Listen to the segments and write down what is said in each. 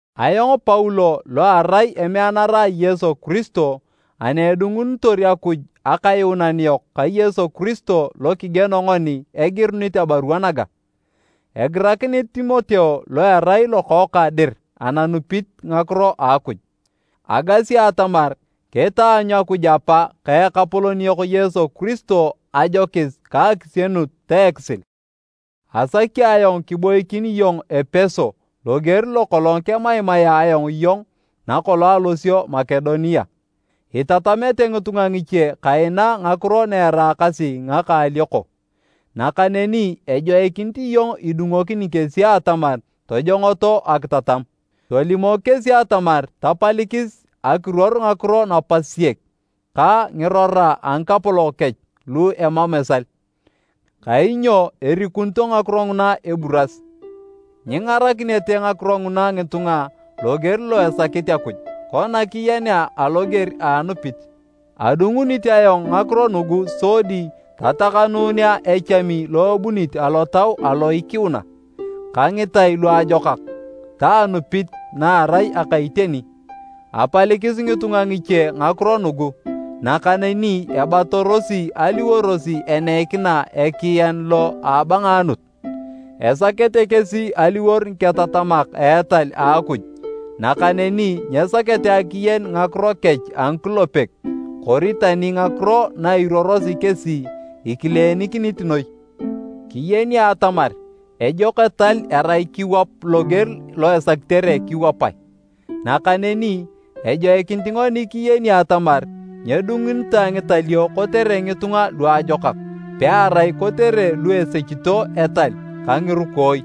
Ayong Paulo lo arai emeanara a Yesu Kiristo ani edungunitor Akuj Akayuunan yok ka Yesu Kiristo lo kigieno ngoni, egirunit abarua naga. Egirakinit Timoteo lo erai lokookang dir ananupit ngakiro a Akuj: Agasi atamar kitaanyu Akuj Apa ka Ekapolon yok Yesu Kiristo ajokis ka akisienut ta ekisil. Asaki ayong kiboikin iyong Epeso loger lo kolong kemaimaea ayong iyong nakolong alosio Makedonia. Itatamete ngitunga ngiche kaina ngakiro na eraakasi ngaka alioko, nakaneni ejoikinit iyong idungokini kesi atamar tojongoto akitatam. Tolimok kesi atamar tapalikis akiruor ngakiro napasiyek ka ngirora a ngapolon kech lu emam esal, kainyo erikunito ngakiro nguna eburas. Nyingarakinete ngakiro nguna ngitunga loger lo esakit Akuj, kona kiyenea aloger a anupit. Adungunit ayong ngakiro nugu sodi tatakanunea echami lo ebunit alotau alo ikiuna, ka ngitai luajokak ta anupit na erai aka iteni. Apalikis ngitunga ngiche ngakiro nugu nakaneni ebatarosi aliwor eneikina ekian lo abangaanut. Esakete kesi aliwor ngiketatamak a etal a Akuj nakaneni nyesakete akiyen ngakiro kech a ngikulepek kori tani ngakiro na iruorosi kesi ikileenikinit noi. Kiyeni atamar ejok etal erai kiwap loger lo esakitere kiwapae. Nakaneni ejoikinit ngoni kiyeni atamar nyedungunitoe ngitalio kotere ngitunga luajokak, pearai kotere lu esechito etal ka ngirukooi,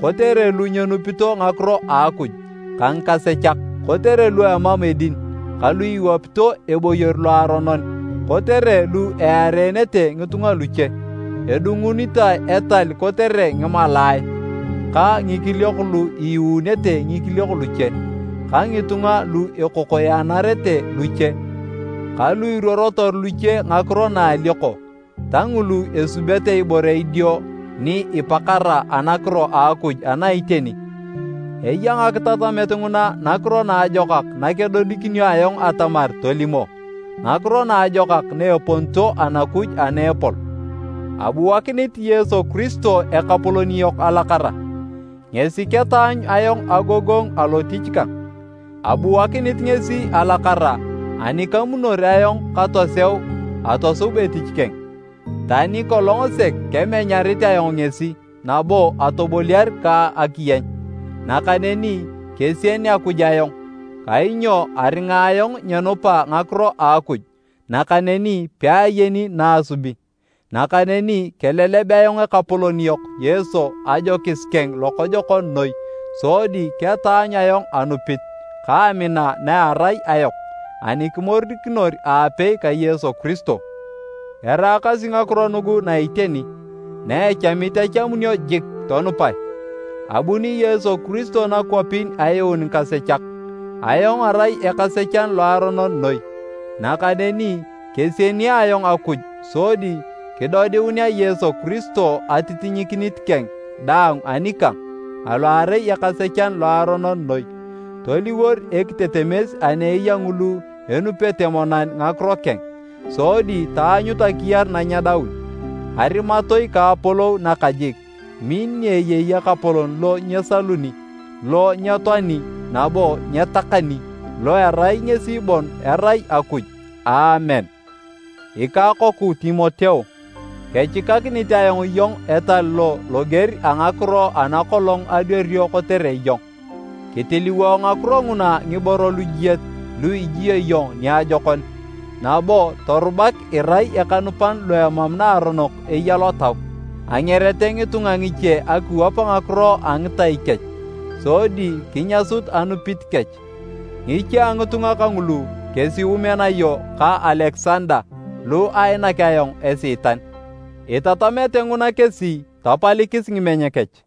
kotere lu nyenupito ngakiro a Akuj ka ngikasechak, kotere lu emam edin ka lu iwapito eboyor loaronon, kotere lu earete taapakech kata itiokech, kotere lu eareenete ngitunga luche, edungunitoe etal kotere ngimalaae, ka ngikiliok lu iiununete ngikiliok luche ka ngitunga lu ekokoyanarete luche ka lu iruorotor luche ngakiro na a alioko ta ngulu esubete ibore idio ni ipakara anakiro a Akuj ana iteni. Eya ngakitatamet nguna nakiro naajokak nakedodikinio ayong atamar tolimo, Ngakiro Naajokak na eponito Anakuj ana epol. Abuakinit Yesu Kiristo Ekapolon yok alakara, ngesi ketaanyu ayong agogongu alotich kang. Abuakinit ngesi alakara ani kamunor ayong katoseu atosub etich keng, tani kolong sek kemenyarit ayong ngesi nabo atoboliar ka akiyeny. Nakaneni kesien Akuj ayong kainyo aringa ayong nyenupa ngakiro a Akuj nakaneni peayeni na asubi. Nakaneni keleleb ayong Ekapolon yok Yesu ajokis keng lokojokon noi sodi ketaanyu ayong anupit ka amina na erai ayok ani kimorikinor aapei ka Yesu Kiristo. Eraakasi ngakiro nugu na iteni, na echamit echamunio jik tonupae, abuni Yesu Kiristo nakwapin ayuun ngikasechak. Ayong arai ekasechan loaronon noi. Nakaneni kesieni ayong Akuj sodi kidodiunea Yesu Kiristo atitinyikinit keng daang anikang alo arai ekasechan loaronon noi, toliwor ekitetemes ani eya ngulu enupete monan ngakiro keng sodi taanyut akiyar nanyedaun. Arimatoi ka apolou nakajik, min ni eyei Ekapolon lo nyesaluni, lo nyetoani nabo nyetakani, lo erai ngesi bon erai Akuj! Aamen. Ikakoku Timoteo, kechikakinit ayong iyong etal lo loger a ngakiro ana kolong adwario kotere iyong. Kitiliwo ngakiro nguna ngiboro lujiet lu ijio iyong niajokon, nabo torubak irai ekanupan lo emam naaronok eya lotau. Angerete ngitunga ngiche akiwap ngakiro a ngitai kech sodi kinyasut anupit kech. Ngiche a ngitunga kangulu kesi Umenayo ka Alekisanda lu ainak ayong Esiitan, itatamete nguna kesi tapalikis ngimeny kech.